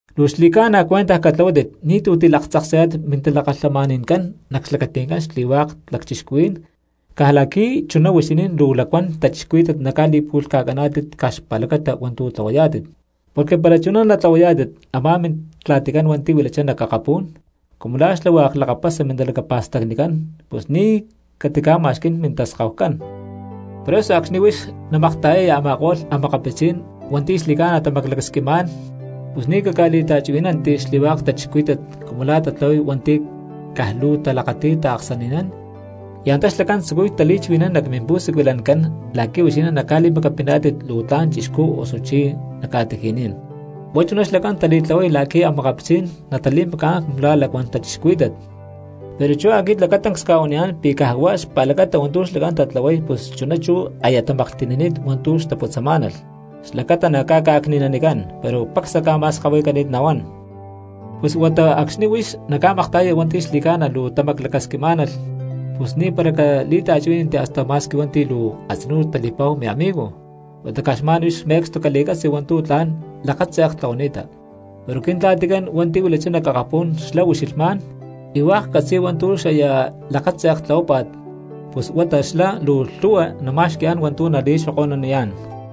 ’Luu xli̠ca̠na cuentaj catlahuátit, ni̠tu̠ tilaktzaksayá̠tit mintalakalhamani̠ncán nac xlacati̠ncán xli̠lhu̠hua lacchixcuhuí̠n caj la̠qui̠ chuná huixinín luu lacuán cristianos naca̠li̠pu̠lhca̠caná̠tit caj xpa̠lacata hua̠ntu̠ tlahuayá̠tit. Porque para chuná natlahuayá̠tit, a̠má Mintla̠ticán hua̠nti̠ huilachá nac akapú̠n, cumu xlá hua̠k lakapasa mintalacapa̠stacnicán pus ni̠ catica̠ma̠xquí̠n mintaskahucán. ’Por eso acxni̠ huix naca̠makta̠yaya a̠ma̠ko̠lh cristianos hua̠nti̠ xli̠ca̠na tamaclacasquixni̠má̠n pus ni̠ caca̠li̠ta̠chuhuí̠nanti xli̠hua̠k cristianos cumu la̠ tatlahuay hua̠nti̠ caj luu talakati̠y taaksani̠nán y antá xlacán tzucuy tali̠chuhui̠nán nac mimpu̠siculancán la̠qui̠ huixinín nali̠macapiná̠tit luu tla̠n chixcú osuchi nac ca̠tiji̠ní̠n. Huá chuná xlacán tali̠tlahuay la̠qui̠ cristianos natali̠macá̠n cumu la̠ lacuán cristianos, pero chú aquit lacatancs cca̠huaniyá̠n pi̠ caj huá xpa̠lacata hua̠ntu̠ xlacán tatlahuay pus chuná chú aya tamaclani̠t hua̠ntu̠ luu xtaputzamá̠nalh xlacata naca̠cni̠nanicán, pero pacsá ca̠ma̠skahuicani̠t nahuán. Pus huata acxni̠ huix naca̠makta̠yaya hua̠nti̠ xli̠ca̠na luu tamaclacasquimá̠nalh pus ni̠para cali̠ta̠chuhuí̠nanti hasta ma̠squi hua̠nti̠ luu a̠tzinú tali̠pa̠hu miamigo, huata caj xma̠n huix me̠cstu cali̠catzi hua̠ntu̠ tla̠n lakatze̠k tlahuani̠ta. Pero Quintla̠ticán hua̠nti̠ huilachá nac akapú̠n xlá ucxilhmá̠n y hua̠k catzi̠y hua̠ntu̠ xaya̠ lakatze̠k tlahuápa̠t pus huata xlá luu lhu̠hua nama̠xqui̠yá̠n hua̠ntu̠ nali̠xoko̠nuniyá̠n.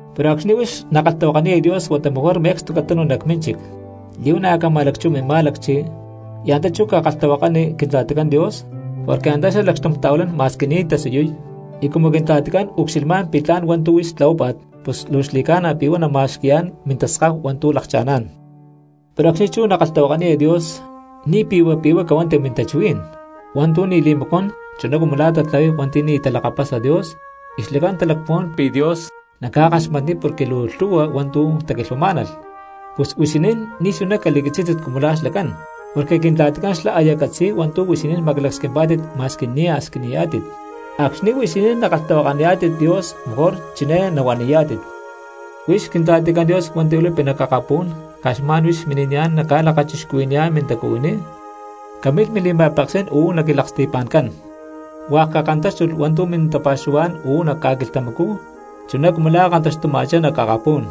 Pero acxni̠ huix nakalhtahuakaniya Dios huata mejor me̠cstu catanu nac mínchic, li̠huana̠ cama̠lacchuhua mimá̠lacchi, y antá chú cakalhtahuakani Quintla̠ticán Dios porque antá xlá lacxtum ta̠huilán ma̠squi ni̠ tasiyuy. Y cumu Quintla̠ticán ucxilhma pi̠ tla̠n hua̠ntu̠ huix tlahuápa̠t, pus luu xli̠ca̠na pi̠ huá nama̠xqui̠yá̠n mintaskahu hua̠ntu̠ lakcha̠ná̠n. ’Pero acxni chú nakalhtahuakaniya Dios ni̠ pi̠hua pi̠huá cahuanti mintachuhuí̠n hua̠ntu̠ ni̠ li̠macuán chuná cumu lá tatlahuay hua̠nti̠ ni̠ talakapasa Dios y xlacán talacpuhuán pi̠ Dios naca̠kaxmatniy porque luu lhu̠hua hua̠ntu̠ taquilhuamá̠nalh. Pus huixinín ni̠ chuná cali̠catzí̠tit cumu la̠ xlacán, porque Quintla̠ticán xlá aya catzi̠y hua̠ntu̠ huixinín maclacasquimpá̠tit ma̠squi nia̠ squiniyá̠tit. Acxni̠ huixinín nakalhtahuakaniyá̠tit Dios mejor chiné nahuaniyá̠tit: Huix Quintla̠ticán Dios hua̠nti̠ huilapi nac akapú̠n, caj xma̠n huix mini̠niyá̠n nacca̠lakachixcuhui̠niyá̠n mintacuhuiní. Camilh mili̠ma̠peksí̠n uú nac quilaksti̠pa̠ncán. Hua̠k cakantáxtulh hua̠ntu̠ mintapa̠xuhuá̠n uú nac ca̠quilhtamacú, chuná cumu la̠ kantaxtuma̠chá nac akapú̠n.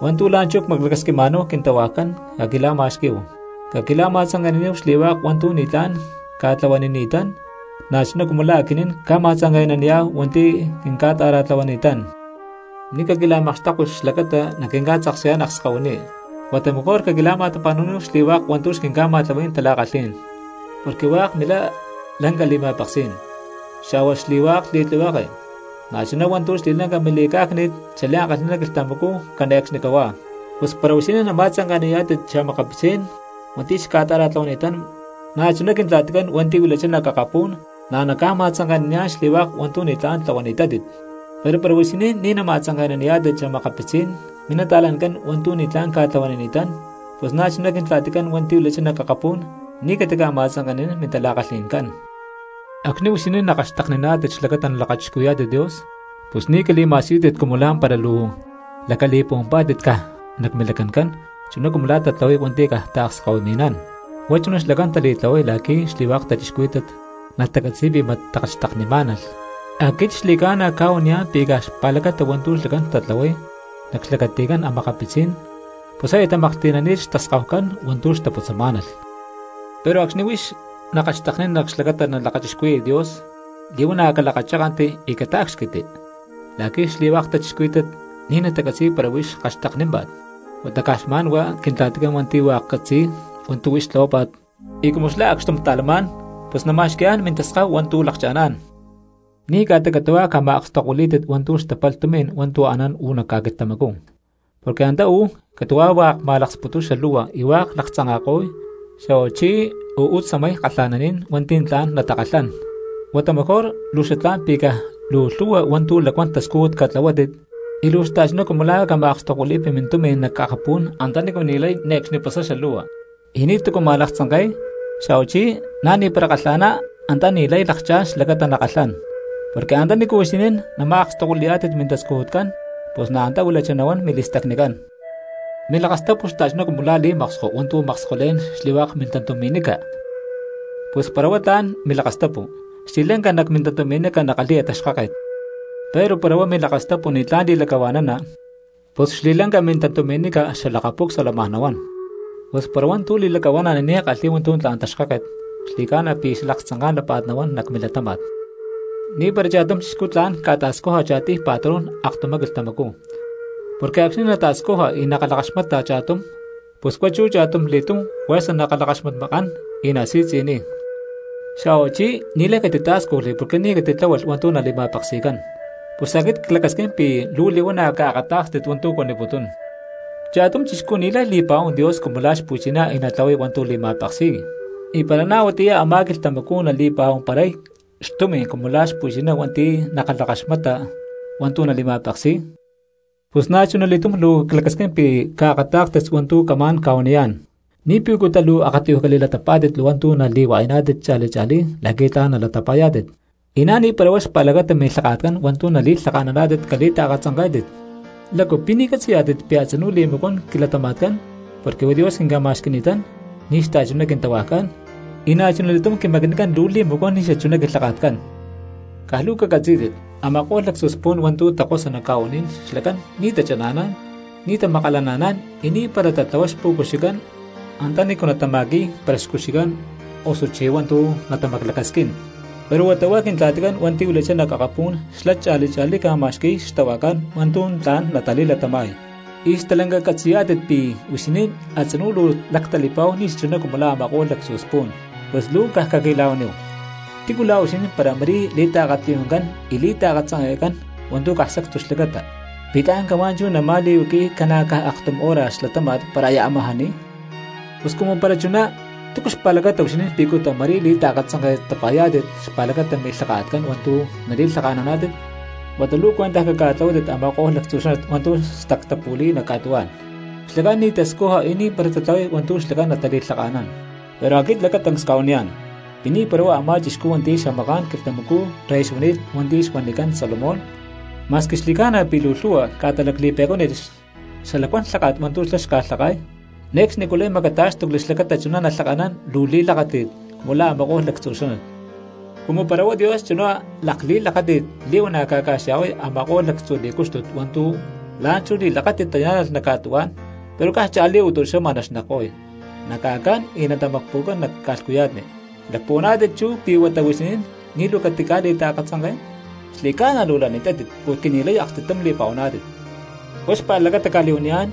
Hua̠ntu̠ la̠nchú cmaclacasquima̠náhu quintahuajcán caquila̠ma̠xquí̠hu. Caquila̠ma̠tzanke̠naníhu xli̠hua̠k hua̠ntu̠ ni̠tlá̠n cca̠tlahuanini̠tán, na̠chuná cumu la̠ aquinín cma̠tzanke̠naniyá̠hu hua̠nti̠ quinca̠ta̠ra̠tlahuani̠tán. Ni̠ caquila̠makxtekui xlacata naquinca̠tzaksayá̠n akskahuiní, huata mejor caquila̠ma̠tapa̠nu̠níhu xli̠hua̠k hua̠ntu̠ xquinca̠ma̠tlahuí̠n tala̠kalhí̠n. Porque hua̠k milá lanca li̠ma̠peksí̠n, xa̠huá xli̠hua̠k li̠tlihueke, na̠ chuná hua̠ntu̠ xli̠lanca mili̠cá̠cni̠t xli̠ankalhi̠ná quilhtamacú cane̠cxnicahuá. ’Pus para huixinín nama̠tzanke̠naniyá̠tit xa̠makapitzí̠n minta̠cristianoscán hua̠nti̠ xca̠ta̠ra̠tlahuani̠tán, na̠chuná Quintla̠ticán hua̠nti̠ huilachá nac akapú̠n na̠ naca̠ma̠tzanke̠naniyá̠n xli̠hua̠k hua̠ntu̠ ni̠tlá̠n tlahuani̠tátit. Pero para huixinín ni̠ nama̠tzanke̠naniyá̠tit xa̠makapitzí̠n minta̠cristianujcán hua̠ntu̠ ni̠tlá̠n ca̠tlahuanini̠tán, pus na̠ chuná Quintla̠ticán hua̠nti̠ huilachá nac akapú̠n ni̠ catica̠ma̠tzanke̠nanín mintala̠kalhi̠ncán. ’Acxni̠ huixinín nakalhxtekniná̠tit xlacata nalakachixcuhui̠yá̠tit Dios, pus ni̠ cali̠ma̠siyútit cumu la̠mpara luu lacali̠puhuampá̠tit caj nac milacancán chuná cumu la̠ tatlahuay hua̠nti̠ caj taakskahuimi̠nán. Huá chuná xlacán tali̠tlahuay la̠qui̠ xli̠hua̠k cristianos natacatzi̠y pi̠ mat takalhxteknimá̠nalh. Aquit xli̠ca̠na cca̠huaniyá̠n pi̠ caj xpa̠lacata hua̠ntu̠ xlacán tatlahuay nac xlacati̠ncán cristianos pus aya tamakamaklhti̠nani̠t xtaskahucán hua̠ntu̠ xtaputzamá̠nalh. Pero acxni̠ huix nakalhxteknina xlacata nalakachixcuhui̠ya Dios, li̠huana̠ calakachákanti y catácxquitti la̠qui̠ xli̠lhu̠hua cristianos ni̠ natacatzi̠y para huix kalhxteknímpa̠t. Huata caj xma̠n huá Quintla̠ticán hua̠nti̠ hua̠k catzi̠y hua̠ntu̠ huix tlahuápa̠t, y cumu xlá acxtum ta̠lamá̠n pus nama̠xqui̠yá̠n mintaskahu hua̠ntu̠ lakcha̠ná̠n. ’Ni̠ ca̠ta catu̠huá cama̠akstokuilí̠tit hua̠ntu̠ xtapalh tumi̠n hua̠ntu̠ anán uú nac ca̠quilhtamacú, porque antá uú catu̠huá hua̠k ma̠laksputuy xalu̠hua y hua̠k laktzanka̠ko̠y, xa̠huachí uú tzamay kalha̠naní̠n hua̠nti̠ tla̠n natakalhán. Huata mejor luu xatlá̠n pi̠ caj luu lhu̠hua hua̠ntu̠ lacuán tascújut caca̠tlahuátit y luu xta̠chuná cumu la̠ a̠ cama̠akstokuili̠pi mintumi̠n nac akapú̠n antanícu ni̠lay ne̠cxni pasay xalu̠hua, y ni̠tu̠cu ma̠laktzanke̠y, xa̠huachí na̠ ni̠para kalha̠ná antá ni̠lay lakchá̠n xlacata nakalhán. Porque antanícu huixinín nama̠akstokuili̠yá̠tit mintascujutcán pus na̠ antá huilachá nahuán mili̠stacnicán. ’Milakastapu xta̠chuná cumu la̠ li̠maksko hua̠ntu̠ makskolé̠n xli̠hua̠k mintantumi̠nica, pus para huá tla̠n milakastapu xli̠lanca nac mintantumi̠nica nakalhi̠ya taxkáket. Pero para huá milakastapu ni̠tlá̠n li̠lacahua̠nana, pus xli̠ca̠lanca mintantumi̠nica xalakaca̠pucsua lamaj nahuán. Pus para hua̠ntu̠ li̠lacahua̠nana ni̠ kalhi̠y hua̠ntu̠ tla̠n taxkáket xli̠ca̠na pi̠ xalaktzanká̠n lápa̠t nahuán nac milatáma̠t. ’Ni̠para cha̠tum chixcú tla̠n ca̠ta̠scuja cha̠tiy patrón aktumá quilhtamacú, porque acxni̠ nata̠scuja y nakalhakaxmata cha̠tum pus huá chú cha̠tumli̠tum juerza nakalhakaxmatmakán y nasi̠tzi̠niy; xa̠huachí ni̠lay catitá̠scujli porque ni̠ catitláhualh hua̠ntu̠ nali̠ma̠peksi̠cán. Pus aquit clacasquín pi̠ luu li̠huana̠ caakatá̠kstit hua̠ntu̠ cuaniputún: Cha̠tum chixcú ni̠lay li̠pa̠huán Dios cumu lá xpu̠chiná y natlahuay hua̠ntu̠ li̠ma̠peksi̠y, y para na̠ huatiyá a̠má quilhtamacú nali̠pa̠huamparay xtumi̠n cumu lá xpu̠chiná hua̠nti̠ nakalhakaxmata hua̠ntu̠ nali̠ma̠peksi̠y. ’Pus na̠chuna li̠túm luu clacasquín pi̠ caakatá̠kstit hua̠ntu̠ camá̠n ca̠huaniyá̠n: Ni̠ picutá luu akatiyuj cali̠latapá̠tit hua̠ntu̠ nali̠hua̠yaná̠tit cha̠li cha̠lí la̠qui̠ tla̠n nalatapa̠yá̠tit, y na̠ ni̠para huá xpa̠lacata milhaka̠tcán hua̠ntu̠ nali̠lhaka̠naná̠tit cali̠taakatzanké̠tit. ¿Lácu pi̠ ni̠ catzi̠yá̠tit pi̠ a̠tzinú li̠macuán quilatama̠tcán porque huá Dios quinca̠ma̠xqui̠ni̠tán, ni̠xachuná quintahuajcán; y na̠chuna li̠túm quimacnicán luu li̠macuán ni̠ xachuná quilhaka̠tcán? Caj luu cacatzí̠tit, a̠ma̠ko̠lh lactzu spu̠n hua̠ntu̠ takosa nac ca̠u̠ní̠n xlacán ni̠ tachana̠nán, ni̠ tamakalana̠nán y ni̠para tatlahuay xpu̠cuxicán antanícu natama̠qui̠y para xcuxicán osuchi hua̠ntu̠ natamaclacasquín. Pero huata huá Quintla̠ticán hua̠nti̠ huilachá nac akapú̠n xlá cha̠li cha̠lí ca̠ma̠xqui̠y xtahuajcán hua̠ntu̠ tla̠n natali̠latama̠y, y stalanca catzi̠yá̠tit pi̠ huixinín a̠tzinú luu lactali̠pa̠hu ni̠ xachuná cumu la̠ a̠ma̠ko̠lh lactzu spu̠n. Pus luu caj caquila̠huaníhu, ¿tícu la̠ huixinín para ma̠rí liakatiyuncán y li̠taakatzanke̠cán hua̠ntu̠ caj sacstu xlacata, pi̠ tla̠n cahuá chú nama̠li̠huaqui̠y ca̠na̠ caj aktum hora xlatáma̠t para aya amajá ni̠y? ’Pus cumu para chuná, ¿túcu xpa̠lacata huixinín picuta ma̠rí li̠ta̠katzanke̠tapa̠yá̠tit xpa̠lacata milhaka̠tcán hua̠ntu̠ nali̠lhaka̠naná̠tit? Huata luu cuentaj caca̠tlahuátit a̠ma̠ko̠lh lactzu xánat hua̠ntu̠ sacstucán tastactapu̠li̠y nac ca̠tuhuá̠n, xlacán ni̠ tascuja y ni̠para tatlahuay hua̠ntu̠ xlacán natali̠lhaka̠nán. Pero aquit lacatancs cca̠huaniyá̠n pi̠ ni̠para huá a̠má chixcú hua̠nti̠ xamaká̠n quilhtamacú rey xuani̠t hua̠nti̠ xuanicán Salomón, ma̠squi xli̠ca̠na pi̠ luu lhu̠hua ca̠ta lacli̠pe̠cuánit xalacuán lháka̠t hua̠ntu̠ xlá xca̠lhaka̠y, ne̠cxnicú lay macatá̠xtucli xlacata chuná nalhaka̠nán luu li̠lakáti̠t cumu la̠ a̠ma̠ko̠lh lactzu xánat. Cumu para huá Dios chuná lakli̠lakáti̠t li̠huana̠ ca̠ca̠xya̠huay a̠ma̠ko̠lh lactzu li̠cúxtut hua̠ntu̠ la̠nchú li̠lakáti̠t tayá̠nalh nac ca̠tuhuá̠n, pero caj cha̠lí o tu̠xama naxnekko̠y, naca̠cán y natamacpu̠cán nac ca̠lhcuya̠tni, ¿lacpuhuaná̠tit chú pi̠ huata huixinín ni̠ luu catica̠li̠ta̠katzanké̠n? ¡Xli̠ca̠na luu lani̠tátit porque ni̠lay aksti̠tum li̠pa̠huaná̠tit! Huá xpa̠lacata cca̠li̠huaniyá̠n,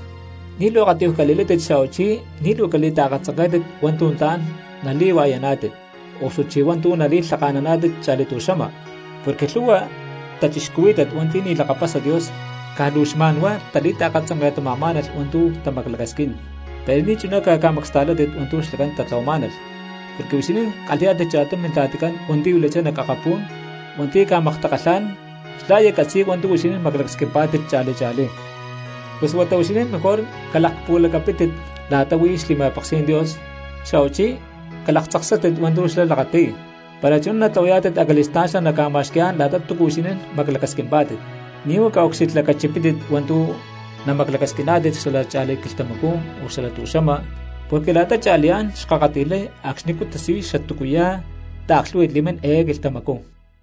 ni̠ luu akatiyuj cali̠látit xa̠huachí ni̠ luu cali̠taakatzanké̠tit hua̠ntu̠ tla̠n nali̠hua̠yaná̠tit osuchí hua̠ntu̠ nali̠lhaka̠naná̠tit cha̠li tu̠xama. Porque lhu̠hua cristianos hua̠nti̠ ni̠ talakapasa Dios caj luu xma̠nhuá tali̠taakatzanke̠tama̠má̠nalh hua̠ntu̠ tamaclacasquín, pero ni̠chuná caca̠macasta̠látit hua̠ntu̠ xlacán tatlahuamá̠nalh, porque huixinín kalhi̠yá̠tit cha̠tum Mintla̠ticán hua̠nti̠ huilachá nac akapú̠n hua̠nti̠ naca̠maktakalhá̠n, xlá aya catzi̠y hua̠ntu̠ huixinín maclacasquimpá̠tit cha̠li cha̠lí. Pus huata huixinín mejor huá calakpuhualacapítit la̠ta huí xli̠ma̠peksí̠n Dios xa̠huachí calaktzaksátit hua̠ntu̠ xlá lakati̠y; para chuná natlahuayá̠tit acali̠stá̠n xlá naca̠ma̠xqui̠yá̠n la̠ta túcua huixinín maclacasquimpá̠tit. Ni̠ huá caucxilhlacachipítit hua̠ntu̠ namaclacasquiná̠tit xala cha̠li quilhtamacú o xala tu̠xama, porque la̠ta cha̠liyá̠n xkakati̠lhay acxnicú tasiyuy xatúcuya̠ taaklhú̠hui̠t li̠mín eé quilhtamacú.